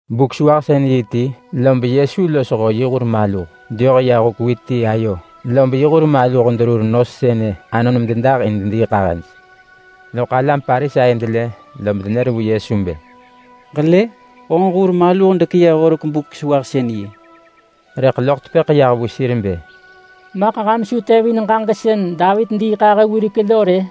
Buk-sewahsën-yi ti lob Yesu losho yi hur maluh deyoh ya huk wit ti ayo, lob yi hur maluh derur nos sënë anon mededah in dediiḳahëj. Loḳ alam Parisai delë lob denër vu Yesu bë, “Ġelë! Honġ hur maluh dekeyëh horek Buk-sewahsën-yi!” Rëḳ loḳ tepëḳ yah vu sir bë, “Maḳ ham su tevin ġaġek sën Davit diiḳahë wirek lo rë?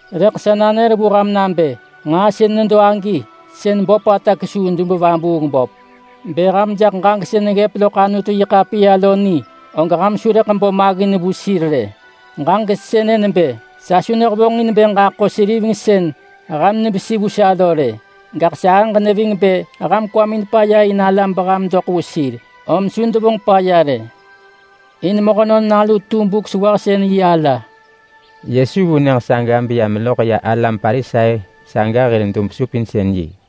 Rëḳ sa nanër vu ham nabë nġaa sën nedo agi, sën böpata kesuu dub-vabuung-böp. Bë ham jaḳ ġaġek sën neggëp loḳ Anutu-yi-ḳapiya lo ni, og ham su rëḳ bo maggin vu sir rë. Ġaġek sënë nebë: ‘Sa su nehevonġin bë ġaḳo seriveng sën ham nevesi vu sa lo rë, gaḳ sahëġ neving bë ham kwamin paya in alam beham doḳ vu sir.’ Om su devonġ paya rë. In Mehönon Nalu tu Buk-sewahsën-yi ala.” Yesu vu nyëġ saga beya meloḳ ya alam Parisai saga hir dub-supinsën-yi.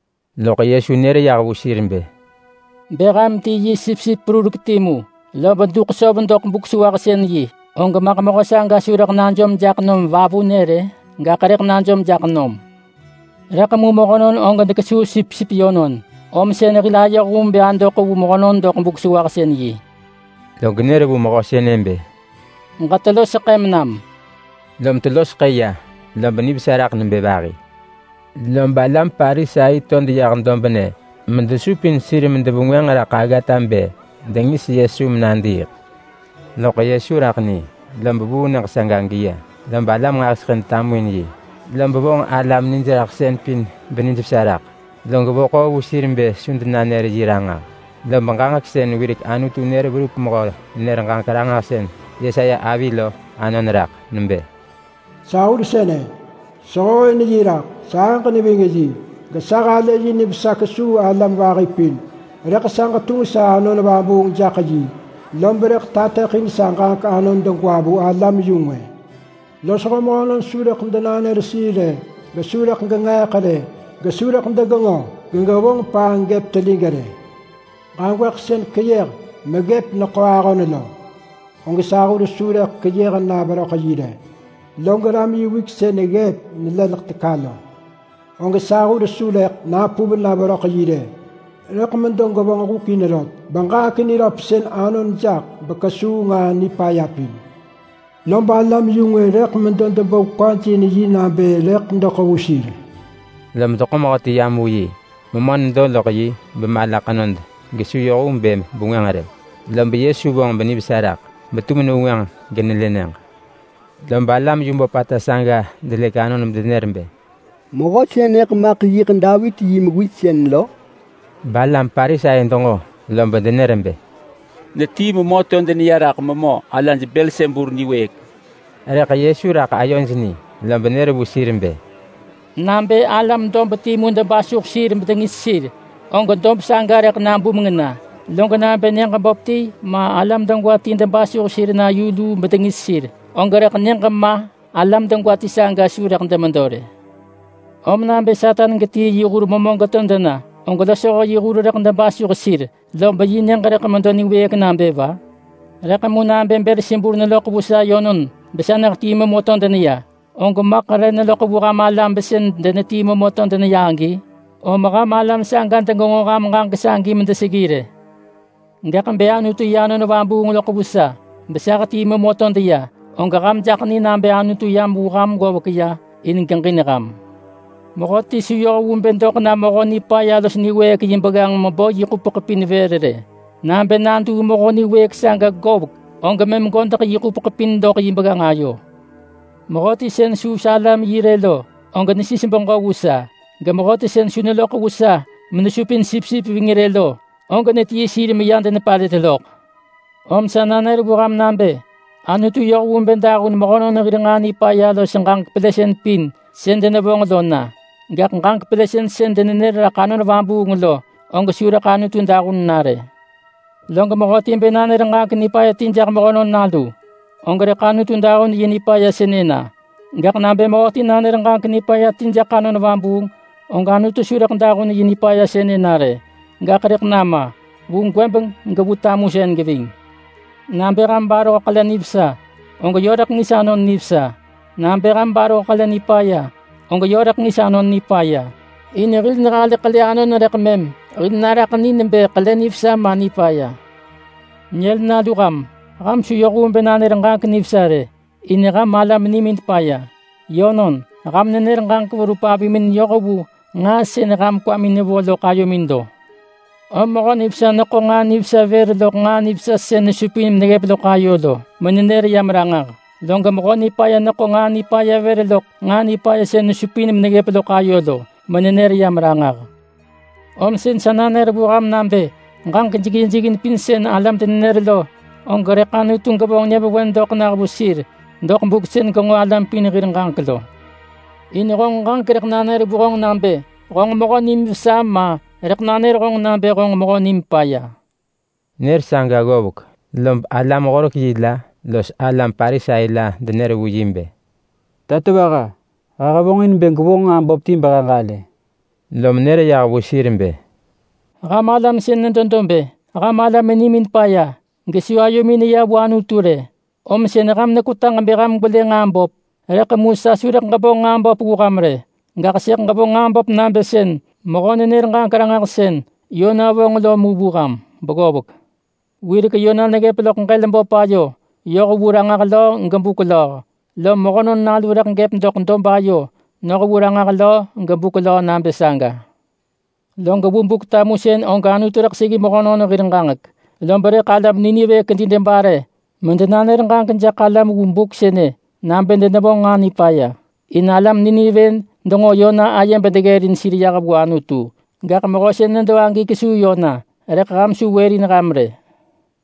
Loḳ Yesu nër yah vu sir bë, “Bë ham ti yi sipsip perurek timu, lob duḳ söv doḳ Buk-sewahsën-yi, og maḳ mehö saga su rëḳ najom jaḳ nom vavunë rë? Gaḳ rëḳ najom jaḳ nom! Rëḳ mu mehönon dekesuu sipsip yönon. Om sën hil ayoh vu bë adoḳ vu mehönon doḳ Buk-sewahsën-yi.” Log nër vu mehö sënë bë, “Ġetelo seḳëm nam!” Lom telo seḳë ya, lob nivesa raḳ nebë vahi. Lob alam Parisai to deyah dobnë medesupin sir medevengwënġ raḳ aggata bë dengis Yesu menadiiḳ. Loḳ Yesu raḳ ni, lob vuu nyëġ saga geya. Lob alam nġahiseḳë detamuin yi, lob vonġ alam nijraḳsën pin benijvesa raḳ. Log vo ḳoo vu sir bë su denanër yi ranġah, lob ġaġek sën wirek Anutu nër verup mehö-nenër-ġaġek-ranġahsën Yesaya avi lo anon raḳ. Nebë: “Sa hur sënë, sehooin yi raḳ, sahëġ neving yi, gesa halë yi nivesa kesuu alam vahi pin. Rëḳ sa ġetunġ sa Anon Vabuung jaḳ yi, lob rëḳ tateḳin sa ġaġek anon degwa vu alam-yu-ngwë. Losho mehönon su rëḳ denanër sir rë, gesu rëḳ genġeeḳ rë, gesu rëḳ degenġo gegevonġ paanġ gëp telig rë. Ġagwëḳ sën keyëh meneggëp neḳo ahon lo, og sa hur su rëḳ keyëh na veröḳ yi rë. Log ram yi wik sën ggëp nelëlek teka lo, og sa hur su rëḳ napuv na veröḳ yi rë. Rëḳ medo gevonġ huk in rot beġaġek niröpsën anon jaḳ bekesuu nġaa nipaya pin. Lob alam-yu-ngwë rëḳ medo debo kwaj in yi nabë rëḳ doḳ vu sir.” Lob deḳo mehöti yam vu yi. Memö nedo loḳ yi bemala ḳenod los su yoh vu bë bengwënġ rë. Lob Yesu vonġ benivesa raḳ, betum nevengwënġ genelë nyëġ. Lob alam yu böpata saga delëk anon bedenër bë, “Mehö sënëḳ maḳ yiḳ Davit yi mewis sën lo?” Rëḳ alam Parisai denġo, lob denër bë, “Netii memö to deneya raḳ memö alaj Belsebul niwëëk.” Rëḳ Yesu raḳ ayoj ni, lob nër vu sir bë, “Nabë alam dob timu debasuh sir bedengis sir, og dob saga rëḳ nabumeng na. Log nabë nyëġ böp ti ma alam degwa ti debasuh sir na yu luu bedengis sir, og rëḳ nyëġ ma alam degwa ti saga su rëḳ demedo rë. Om nabë Satan getii yi hur memö geto dena, og losho yi hur rëḳ debasuh sir, lom yi nyëġ rëḳ medo niwëëk nabë va? Rëḳ mu nabë Belsebul neloḳ vu sa yönon besa nehetii memö to deneya, og maḳ re neloḳ vu ham alam besën denetii memö to deneya agi? Om ham alam saga degenġo ham ġaġek sagi medeseggi rë. Gaḳ bë Anutu yi Anon Vabuung loḳ vu sa, besa hetii memö beto deneya, og ham jaḳ ni nabë Anutu yam vu ham ggovek ya in bë geġin ham. Mehöti su yoh vu bë doḳ na Mehö Nipaya los niwëëk saga yi begganġ mebo yi ḳupeḳ pin vër rë. Nabë naduu mehö niwëëk saga govek, og mëm godeḳ yi ḳupeḳ pin sën nedo loḳ yi begganġ ayo lo. Mehöti sën su sa alam yi rë lo, og nesis beġö vu sa. Gemehöti sën su neloḳ vu sa menesupin sipsip ving rë lo, og netii sir meya denepalët loḳ. Om sa nanër vu ham nabë Anutu yoh vu bë dahun mehönon hir nġaa nipaya los ġaġek pelësën pin sën denevonġ lo na. Gaḳ ġaġek pelësën sën denenër raḳ Anon Vabuung lo, og su rëḳ Anutu dahun na rë. Log mehöti bë nanër ġaġek nipaya ti jaḳ Mehönon Nalu, og rëḳ Anutu dahun yi nipaya sënë na. Gaḳ nabë mehöti nanër ġaġek nipaya ti jaḳ Anon Vabuung, og su rëḳ Anutu dahun yi nipaya sënë na rë. Gaḳ rëḳ nama, vu gwëbeng gevu tamusën geving.” “Nabë ham baroh ḳele nivesa, og yö rëḳ ngis anon nivesa. Nabë ham baroh ḳele nipaya, og yö rëḳ ngis anon nipaya. In hil nehalë ḳele anon rëḳ mëm hil naraḳ ni nebë ḳele nivesa ma nipaya. Nyël nalu ham! Ham su yoh vu bë nanër ġaġek nivesa rë, in ham alam nimin paya. Yönon, ham nenër ġaġek verup avimin yoh vu nġaa sën ham kwamin nevo loḳ ayomin lo. Om mehö nivesa neḳo nġaa nivesa vër loḳ nġaa nivesa sën nesupin meneggëp loḳ ayo lo, menenër yam ranġah, log mehö nipaya neḳo nġaa nipaya vër loḳ nġaa nipaya sën nesupin meneggëp loḳ ayo lo, menenër yam ranġah. Om sën sa nanër vu ham nabë ġaġek jeggin jeggin pin sën alam denenër lo, og rëḳ Anutu gevonġ nyëvewen doḳ nah vu sir doḳ buk sën genġo alam pin hir ġaġek lo. In honġ ġaġek rëḳ nanër honġ nabë honġ mehö nim vesa ma rëḳ nanër honġ nabë honġ mehö nim paya.” Nër saga ggovek lob alam-horek-yi la los alam Parisai la denër vu yi bë, “Tatovaha, he hevonġin bë gwevonġ nġaa böp ti behe ġalë.” Lom nër yah vu sir bë, “Ham alam sën nedo dob-ë, ham alam nimin paya. Ham nebë avëh baggëb, om sën ham nekwetaġ bë ham gwelë nġaa böp. Rëḳ mu sa su rëḳ ġevonġ nġaa böp vu ham rë. Gaḳ sëḳ ġevonġ nġaa böp nabë sën mehö-nenër-ġaġek-ranġahsën Yona yi nġaa böp lo mu vu ham beggovek. Wirek Yona neggëp loḳ ġël böp ayo yoh vu ranġah löö gebuk löö, lom Mehönon Nalu rëḳ gëp doḳ dob ayo noh vu ranġah löö gebuk löö nabë saga. Log vu Buk-tamusën og Anutu rëḳ seggi mehönon hir ġaġek, lob rëḳ alam Nineve kedi debare medenanër ġaġek jaḳ alam vu buk sënë nabë denevonġ nġaa nipaya. In alam Nineve denġo Yona aye bedeggërin sir yah vu Anutu. Gaḳ Mehö sën nedo agi kesuu Yona, rëḳ ham su wërin ham rë.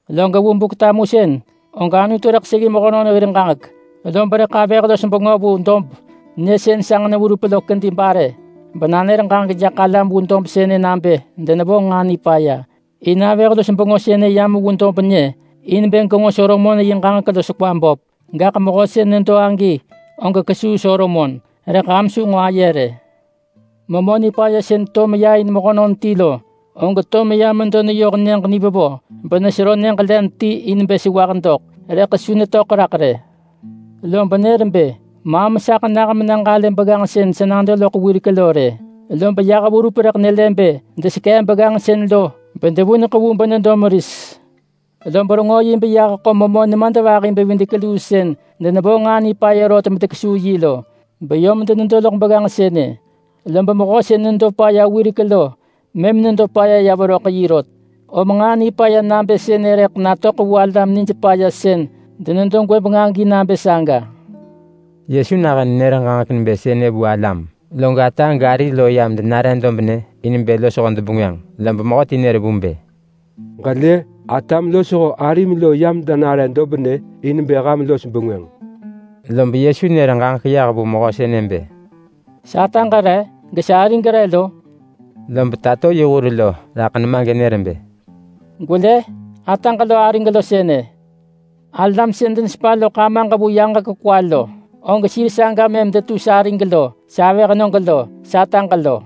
Log vu Buk-tamusën og Anutu rëḳ seggi mehönon hir ġaġek, lob rëḳ avëh-los-bengö vu dob nyë sën sanġ-neverup lo kedi bare menanër ġaġek jaḳ alam vu buk sënë nabë denevonġ nġaa nipaya. In avëh-los-bengö sënë yam vu dob nyë in bë genġo Solomon yi ġaġek los kwa böp. Gaḳ Mehö sën nedo agi og kesuu Solomon, rëḳ ham su nġo aye rë.” “Memö nipaya sën to meya in mehönon ti lo, og to meya medo neyoh nyëġ nivevo benesero nyëġ len ti in bë sewah doḳ, rëḳ su netöḳ raḳ rë. Lom nër bë, ‘Maam saḳ nah mena ġalë begganġ sën sa nado loḳ wirek lo rë!’ Lob yah verup rëḳ nelë bë desekee begganġ sën lo bedevuneḳ vu benedo meris. Lob rengö yi beyah ḳo memö nemadvahi-bevidek-luu sën denevonġ nġaa nipaya rot medenekesuu yi lo, beyom denedo loḳ begganġ sënë. Lob mehö sën nedo paya wirek lo mëm nedo paya ya veröḳ yi rot. Om nġaa nipaya nabë sënë rëḳ natöḳ vu alam nij paya sën denedo gwëbeng agi nabë saga.” Yesu nahën nenër ġaġek nebë sënë vu alam, log ata gari lo yam denare dobnë in bë losho debengwënġ. Lob mehöti nër vu bë, “Ġelë, atam losho arim lo yam denare dobnë in bë ham los bengwënġ.” Lob Yesu nër ġaġek yah vu mehö sënë bë, “Sataġ re? Gesarig re lo?” Lob tato yi hur lo raḳ nema genër bë, “Gwelë! Ataġ lo arig lo sënë. Alam sën denesepa loḳ Amaġ vu yaġek kwa lo, og sir saga mëm detu sarig lo, savëhnög lo, sataġ lo!”